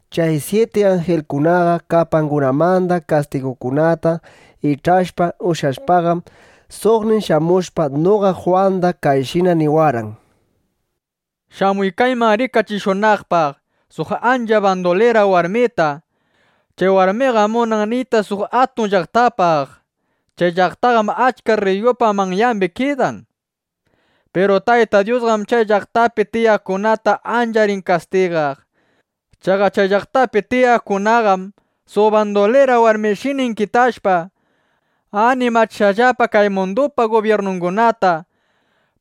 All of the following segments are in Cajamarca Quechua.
Chay syiti anjilkunaqa kupangunamanda kastigukunata ich'ashpa ushyashpaqam, suqnin shamushpa, noqa Jwanda kayshina niwarqan: —Shamuy kayman rikachishunaqpaq suq ancha bandulira warmita. Chay warmiqam munan niyta suq atun llaqtapaq. Chay llaqtaqam achka rriyukunapa manyangunapi kidan. Piru Tayta Dyusqam chay llaqtapi tiyaqkunata ancha rin kastigaq. Chaqa chay llaqtapi tiyaqkunaqam suq bandulira warmishina inkitashpa, animachishqallapa kay mundupa gubyirnungunata,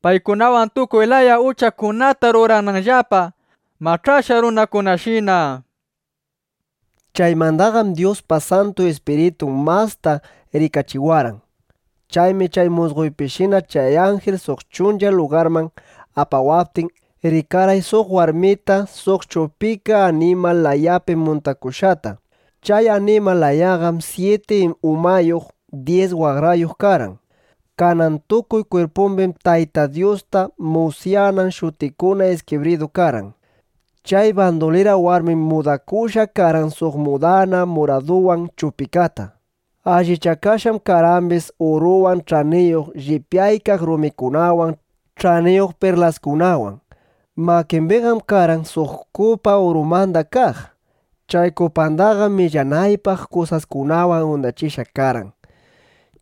paykunawan tukuy laya uchakunata rurananllapa mach'ashqa runakunashina, nishpa. Chaymandaqam Dyuspa Santu Ispiritun masta rikachiwarqan. Chaymi chay musqoypishina chay anjil suq chuncha lugarman apawaptin, rikarqay suq warmita suq chupika animal layapi muntakushqata. Chay animal layaqam syiti umayuq, dyis waqrayuq karqan. Kanan tukuy kwirpumbim Tayta Dyusta musyanan shutikuna iskibridu karqan. Chay bandulira warmim mudakushqa karqan suq mudana muraduwan chupikata. Allichakashqam karqambis uruwan, ch'aniyuq llipyaykaq rumikunawan, ch'aniyuq perlaskunawan. Makimbiqam karqan suq kupa urumanda kaq. Chay kupandaqam millanaypaq kusaskunawan undachishqa karqan.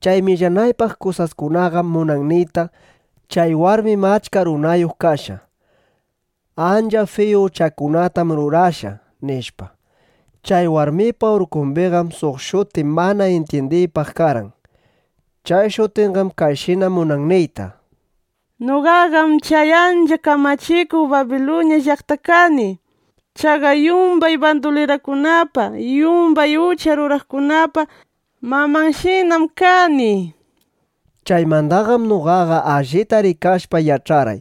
Chay millanaypaq kusaskunaqam munan niyta, chay warmim achka runayuq kashqa. Ancha fiyu uchakunatam rurashqa, nishpa. Chay warmipa urkumbiqam suq shuti mana intyindiypaq karqan. Chay shutinqam kayshina munan niyta: “Noqaqam chay ancha kamachikuq Babiluña llaqta kani. Chaqa yumbay bandulirakunapa, yumbay ucha ruraqkunapa mamanshinam kani”, nishpa. Chaymandaqam noqaqa allita rikashpa yach'arqay: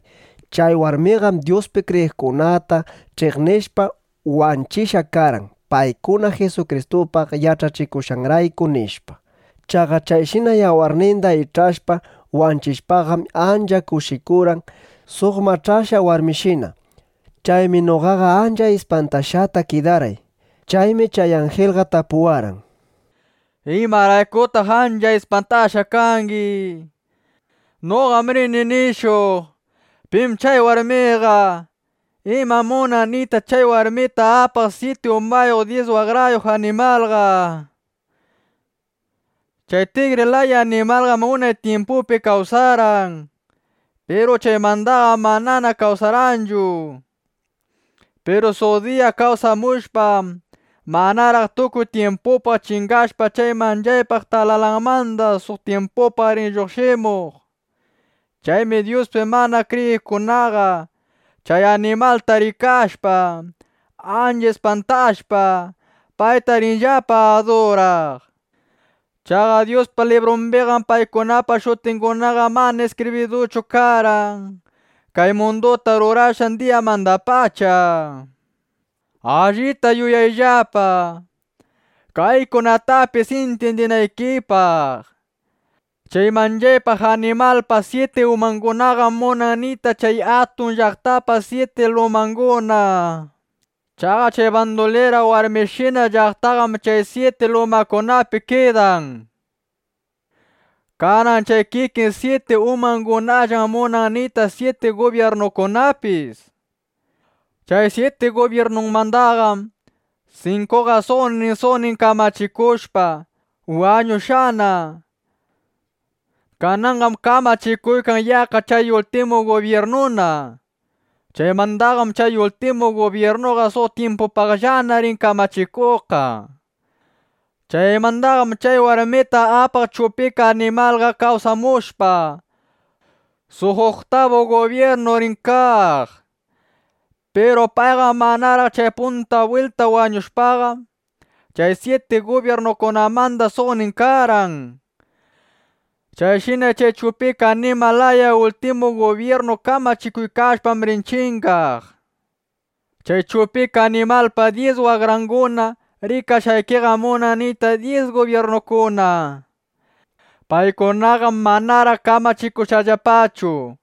Chay warmiqam Dyuspi kriyiqkunata ch'iqnishpa wanchishqa karqan, paykuna Jisukristupaq yach'achikushqanrayku, nishpa. Chaqa chayshina yawarninda ich'ashpa wanchishpaqam, ancha kushikurqan suq mach'ashqa warmishina. Chaymi noqaqa ancha ispantashqata kidarqay. Chaymi chay anjilqa tapuwarqan: —¿Imaraykutaq ancha ispantashqa kangi? Noqam rini nishuq, pim chay warmiqa, imam munan niyta chay warmita apaq syiti umayuq dyis waqrayuq animalqa, nishpa. Chay tigri laya animalqam unay tyimpupi kawsarqan. Piru chaymandaqam manana kawsarqanchu. Piru suq diya kawsamushpa, manaraq tukuy tyimpupaq chingashpa chay manchaypaq talalanmanda suq tyimpupaq rin lluqshimuq. Chaymi Dyuspi mana kriyiqkunaqa chay animalta rikashpa, ancha ispantashpa, payta rinllapa aduraq. Chaqa Dyuspa librumbiqam paykunapa shutingunaqa mana iskibriduchu karqan kay munduta rurashqan diyamandapacha. ’Allita yuyayllapa, kaykunatapis intyindinaykipaq. Chay manchaypaq animalpa syiti umangunaqam munan niyta chay atun llaqtapa syiti lumanguna. Chaqa chay bandulira warmishina llaqtaqam chay syiti lumakunapi kidan. Kanan chay kikin syiti umangunallam munan niyta syiti gubyirnukunapis. Chay syiti gubyirnumandaqam sinkuqa suqnin suqnin kamachikushpa, wañushqana. Kananqam kamachikuykan yaqqa chay ultimu gubyirnuna. Chaymandaqam chay ultimu gubyirnuqa suq tyimpitupaqllana rin kamachikuqqa. Chaymandaqam chay warmita apaq chupika animalqa kawsamushpa, suq uktabu gubyirnu rin kaq. Piru payqam manaraq chay punta bwilta wañushpaqa, chay syiti gubyirnukunamanda suqnin karqan. Chayshina chay chupika animal laya ultimu gubyirnu kamachikuykashpam rin chingaq. ’Chay chupika animalpa dyis waqranguna rikashqaykiqam munan niyta dyis gubyirnukuna. Paykunaqam manaraq kamachikunllapachu.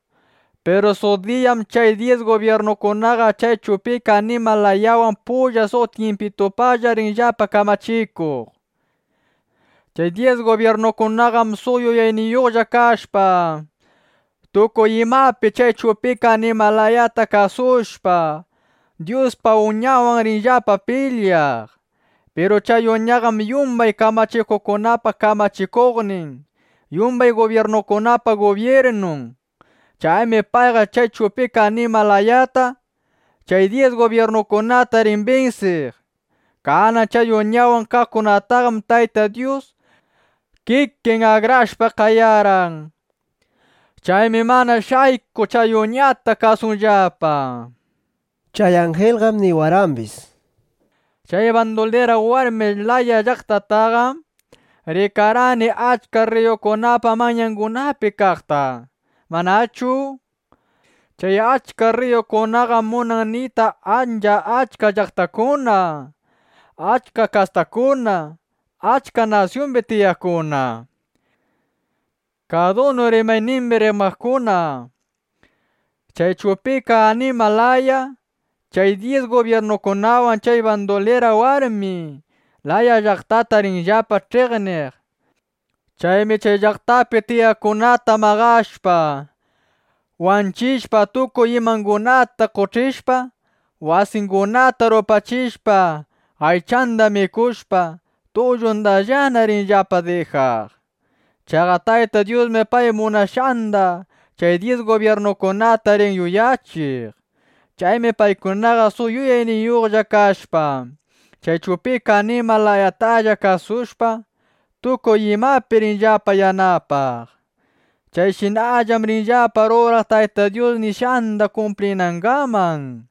Piru suq diyam chay dyis gubyirnukunaqa chay chupika animal layawan pulla suq tyimpitupaqlla rinllapa kamachikuq. Chay dyis gubyirnukunaqam suq yuyayniyuqlla kashpa, tukuy imapi chay chupika animal layata kasushpa, Dyuspa Uñanwan rinllapa pilyaq. Piru chay Uñaqam yumbay kamachikuqkunapa kamachikuqnin, yumbay gubyirnukunapa gubyirnun. Chaymi payqa chay chupika animal layata, chay dyis gubyirnukunata rin binsiq. Kanan chay Uñawan kaqkunataqam Tayta Dyus kikin akrashpa qayarqan. Chaymi mana shaykuq chay Uñata kasunllapa. Chay anjilqam niwarqambis: —Chay bandulira warmi laya llaqtataqam rikarqayki achka rriyukunapa manyangunapi kaqta, ¿manachu? Chay achka rriyukunaqam munan niyta ancha achka llaqtakuna, achka kastakuna, achka nasyumbi tiyaqkuna, kadunu rimaynimbi rimaqkuna. Chay chupika animal laya chay dyis gubyirnukunawan chay bandulira warmi laya llaqtata rinllapa ch'iqniq. Chaymi chay llaqtapi tiyaqkunata maqashpa, wanchishpa, tukuy imangunata qoch'ishpa, wasingunata rupachishpa, aychanda mikushpa, tullundallana rinllapa dijaq. Chaqa Tayta Dyusmi pay munashqanda chay dyis gubyirnukunata rin yuyachiq. Chaymi paykunaqa suq yuyayniyuqlla kashpa, chay chupika animal layatalla kasushpa, tukuy imapi rinllapa yanapaq. Chayshinam rinllapa ruraq Tayta Dyus nishqanda kumplinangaman.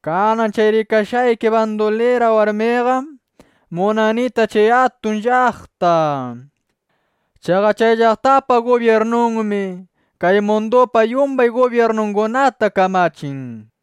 Kanan chay rikashqayki bandulira warmiqam munan niyta chay atun llaqta. Chaqa chay llaqtapa gubyirnunmi kay mundupa yumbay gubyirnungunata kamachin, nishpa.